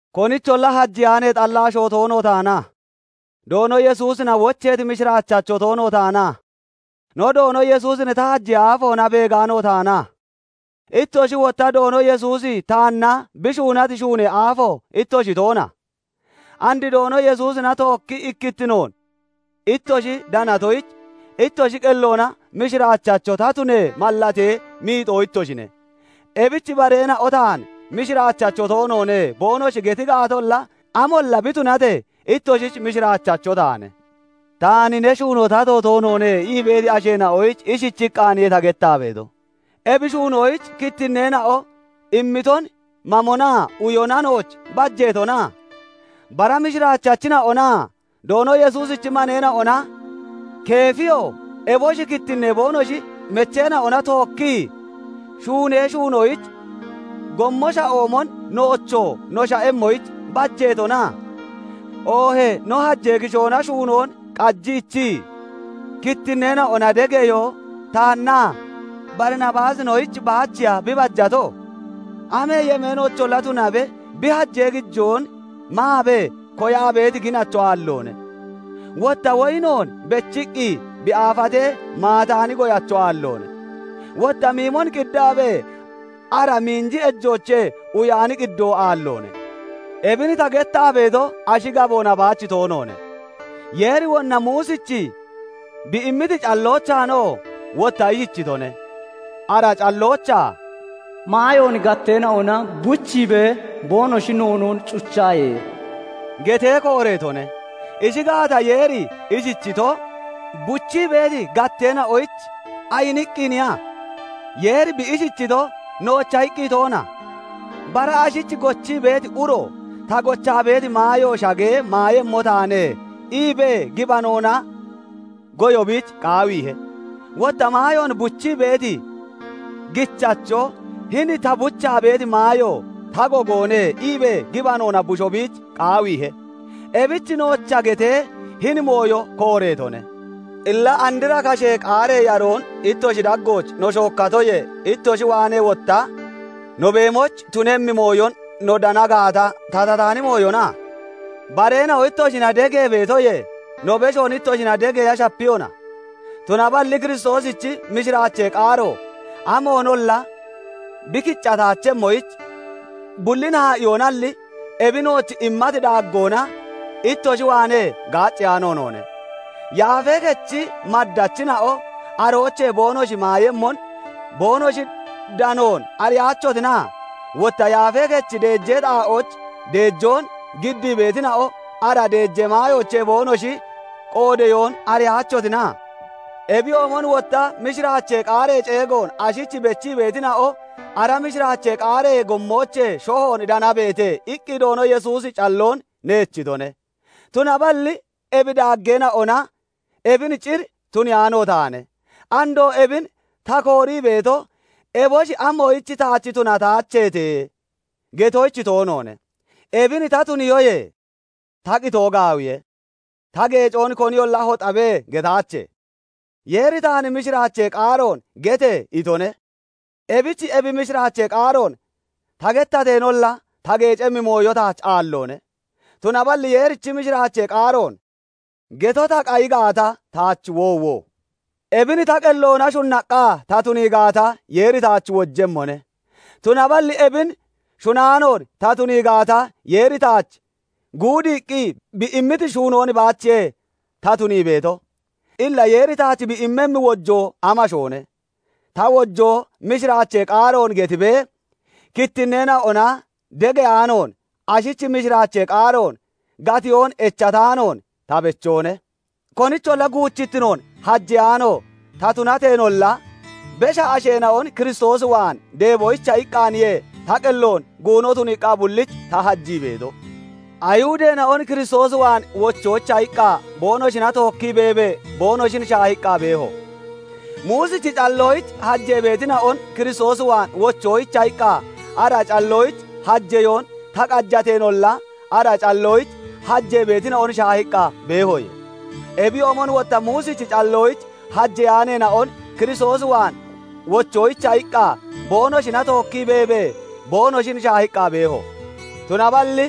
Konicholla hajeyaanee xalla asho toono taana? Doono Yesuusina wocheeti mishiraachacho toono taana? No Doono Yesuusin ta hajee aafoona beegaano taana? Ittoshi wotta Doono Yesuusi taanna bi shuunati shuunee aafo ittoshi toona? And Doono Yesuusina tookkii ikkittinoon ittoshi danatoyich, ittoshi qelloona mishiraachacho ta tunee mallatee miixoo ittoshine. Ebich bareena'o taan "Mishiraachacho toonoone" boonoshi geti gaatolla, amolla bi tunatee ittoshich mishiraachacho taane. Taan "Ne shuunoo tato toonoone" ii beeti asheena'oyich ishichiqqaaniye ta gettaa beeto; ebi shuunoyich kittinneena'o immiton mamonaa uyona nooch bajeetona? Bara mishiraachachina'onaa Doono Yesuusichi maneena'ona, Keefiyoo eboshi kittinnee boonoshi mecheena'ona tookkii shuunee shuunoyich gommo sha'oomon, noochoo no sha'emmoyich bajeetona? Oohee no hajee kishoona shuunoon qajiichii kittinneena'ona degeyoo taannaa Barinabaasinoyich baachiya bi bajeeto? Amee yemeenoocholla tunabe, bi hajee gijoon maabee koyaa beeti ginacho aalloone. Wotta woyinoon bechiqqi bi aafatee, maataani goyacho aalloone. Wotta miimon qiddaabee, ara miinji ejoochee uyaani qiddoo aalloone. Ebin ta gettaa beeto, ashi gaboona baach toonoone; Yeeri wonna Muusich bi immiti calloochaanoo wotta ishichitone. Ara calloochaa "Maayoon gatteena'ona buchiibee boonoshi noonoon cuchaaye!" getee kooreetone. Ishi gaata, Yeeri ishichito, buchii beeti gatteena'oyich ayiniqqiniya? Yeeri bi ishichito, noocha iqqi toona? Bara ashich gochii beeti uro "Ta gochaa beeti maayo shagee maayemmo taane" iibee, gibanoona goyo biich qaawiihe; wotta maayoon buchii beeti gichacho "Hini ta buchaa beeti maayo ta gogoone" iibee gibanoona busho biich qaawiihe; ebich noocha getee hini mooyo kooreetone. Illa andra kashee qaaree yaroon ittoshi daggooch no shookkatoyee, ittoshi waanee wotta no beemoyich tunemmi mooyon no dana gaata, tatataani mooyona? Bareena'o ittoshina degee beetoyee no beshoon ittoshina degeeya shapiyona? Tunaballi Kiristoosichi mishiraachee qaaro amoonolla bi kicataachemmoyich, bullin haa'iihonalli, ebi nooch immati daaggoona ittoshi waanee gaacceyaano noone. Yaafee kechi maddachina'o aroochee boonoshi maayemmon boonoshi danoon ariyaachotina? Wotta yaafee kechi deejee xaa'ooch deejoon giddii beetina'o ara deejee maayoochee boonoshi qoodeyoon ariyaachotina? Ebiyoomon wotta "Mishiraachee qaaree ceegoon ashich bechii beetina'o ara mishiraachee qaaree gommoochee shohoon danabeete" iqqi Doono Yesuusi calloon neechitone. Tunaballi ebi daaggeena'ona ebin cir tuniyaano taane. Andoo ebin ta koorii beeto, "Eboshi amoyich taach tunataacheete?" getoyich toonoone. Ebin ta tuniyoyee ta qitoo gaawiye. Ta geecoon koniyolla "Hoxabe!" getaache. Yeeri taan "Mishiraachee qaaroon gete!" itone. Ebich ebi mishiraachee qaaroon ta gettateenolla, ta geecemmi mooyo taach aalloone; tunaballi Yeerichi mishiraachee qaaroon geto ta qayi gaata, taach woowo! Ebin ta qelloona shunnaqqa ta tunii gaata, Yeeri taach wojemmone; tunaballi ebin shunaanoon ta tunii gaata, Yeeri taach guudiiqqi bi immiti shuunoon baachiye ta tunii beeto; illa Yeeri taach bi immemmi wojoo amashoone? Ta wojoo, mishiraachee qaaroon gettiibee kittinneena'ona degeyaanoon, ashich mishiraachee qaaroon gatiyoon echataanoon ta bechoone. Konicholla guuchittinoon hajeyaano ta tunateenolla, besha asheena'on Kiristoos waan deeboyicha iqqaaniye ta qelloon guuno tuniiqqa bullich ta hajii beeto. Ayihudeena'on Kiristoos waan wochoyicha iqqa, boonoshina tookkii beebee boonoshin shaahiqqa beeho; Muusichi calloyich hajee beetina'on Kiristoos waan wochoyicha iqqa, ara calloyich hajeyoon ta qajateenolla, ara calloyich hajee beetina'on shaahiqqa beehoye. Ebiyoomon wotta Muusichi calloyich hajeyaaneena'on Kiristoos waan wochoyicha iqqa boonoshina tookkii beebee boonoshin shaahiqqa beeho; tunaballi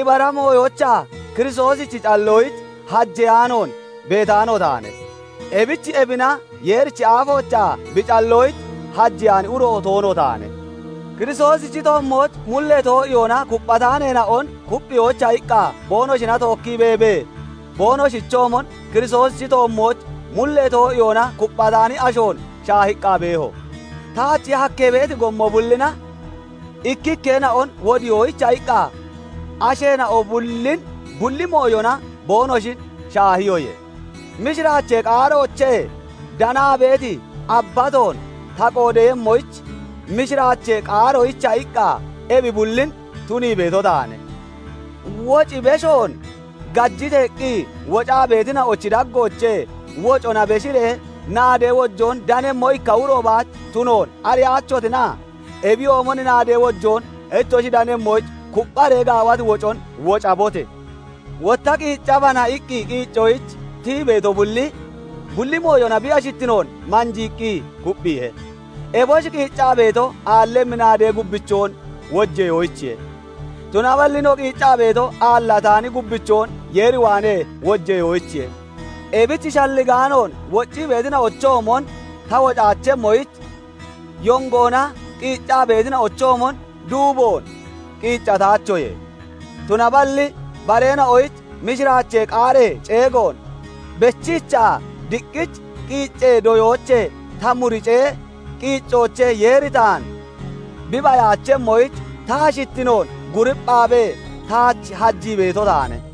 ibara mooyoochaa Kiristoosichi calloyich hajeyaanoon beetaano taane; ebich ebina Yeerichi aafoochaa bi calloyich hajeyaani uro toono taane; Kiristoosichi toommooch mullee too'iyoona kupphataaneena'on kupphiyoyicha iqqa boonoshina tookkii beebee boonoshichoomon Kiristoosichi toommooch mullee too'iyoona kupphataani ashoon shaahiqqa beeho; taach hakkee beeti gommo bullina ikkikkeena'on wodiyoyicha iqqa asheena'o bullin bulli mooyona boonoshin shaahiyoye. Mishiraachee qaaroochee danaa beeti abbatoon ta qoodeeyemmoyich, mishiraachee qaaroyicha iqqa ebi bullin tunii beeto taane. Woccii beshoon gajiteeqqi wocaa beetina'ochi daggoochee wocona beshiree naadee wojoon danemmo ikka uro baach tunoon ariyaachotina? Ebiyoomon naadee wojoon ittoshi danemmoyich kuppharee gaawati wocon wocabote! Wotta "Qiiccabana" iqqi qiiccoyich tiyii beeto bulli, bulli mooyona bi ashittinoon manjiiqqi kupphiihe. Eboshi qiiccaa beeto, aallemmi naadee gubbichoon wojeyoyichiye; tunaballi no qiiccaa beeto, aallataani gubbichoon Yeer waanee wojeyoyichiye. Ebich shalligaanoon woccii beetina'ochoomon ta wocaachoye; yongoona qiiccaa beetina'ochoomon duuboon qiiccataachoye. Tunaballi bareena'oyich mishiraachee qaaree ceegoon bechiichaa, diqqich qiiccee doyoochee ta muricee qiiccoochee Yeeri taan bi bayaachemmoyich, ta ashittinoon guripphaabee taach hajii beeto taane.